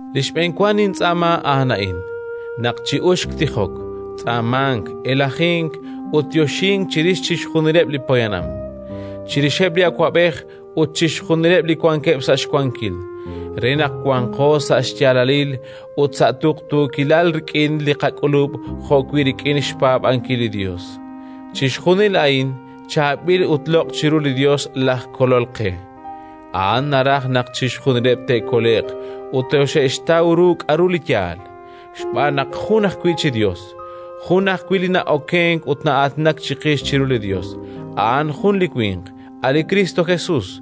Li xb'enwa nintz'aama a'an a'in: naq chi'uxq tijok, tz'aamank, elajink ut yoxink chirix chixjunileb' li poyanam; chirixeb' li awab'ej ut chixjunileb' li wankeb' sa' xwankil, re naq wanqo sa' xyaalalil ut sa' tuqtuukilal rik'in li qak'ulub' jo'wi' rik'in xpaab'ankil li Yos. Chixjunil a'in chaab'il ut loq' chiru li Yos laj Kolol qe: A'an naraj naq chixjunileb' te'kole'q ut toxe'xtaw ru k'aru li yaal. Xb'aan naq jun ajwi' chi Yos, jun ajwi' li na'okenk ut na'aatinak chiqix chiru li Yos: a'an jun li winq, a' li Kristo Jesus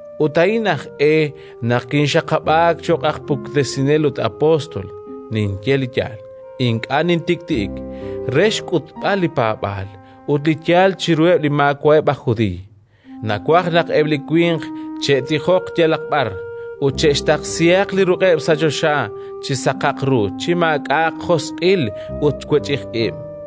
ut a'in aj e naq kinxaqab'aak cho'q aj puktesinel ut apóstol (ninye li yaal, ink'a' nintik'ti'ik), re xk'utb'al li paab'aal ut li yaal chiruheb' li maawa'eb' aj Judiiy. Nawaj naq eb' li winq che'tijoq yalaq b'ar ut che'xtaqsihaq li ruq'eb' sa' choxa chi saqaq ru, chi maak'a'aq josq'il ut wech'ij ib'.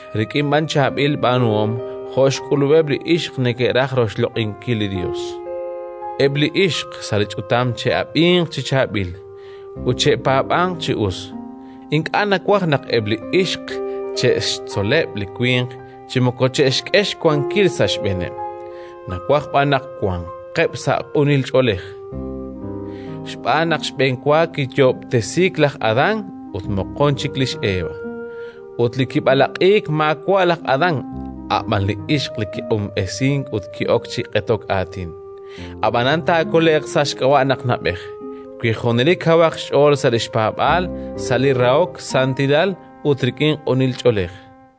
rik'in b'an chaab'il b'aanuhom jo' xk'ulub'eb' li ixq neke'raj roxloq'inkil li Yos. Eb' li ixq sa' li ch'utam che'ab'inq chi chaab'il ut che'paab'anq chi us. Ink'a' nawaj naq eb' li ixq che'xtzoleb' li winq chi moko che'xk'e xwankil sa' xb'eeneb'; nawaj b'an naq wanqeb' sa' q'unil ch'oolej. Xb'aan naq xb'enwa kiyoob'tesiik laj Adán ut moqon chik lix Eva. Ut li kib'alaq'iik maawa' laj Adán, a' b'an li ixq li kiq'unb'esiik ut ki'ok chi q'etok aatin. Ab'anan taakole'q sa' xk'ab'a' naq na'b'ej, wi junelik kawaq xch'ool sa' li xpaab'aal, sa' li rahok, santilal, ut rik'in q'unil ch'oolej.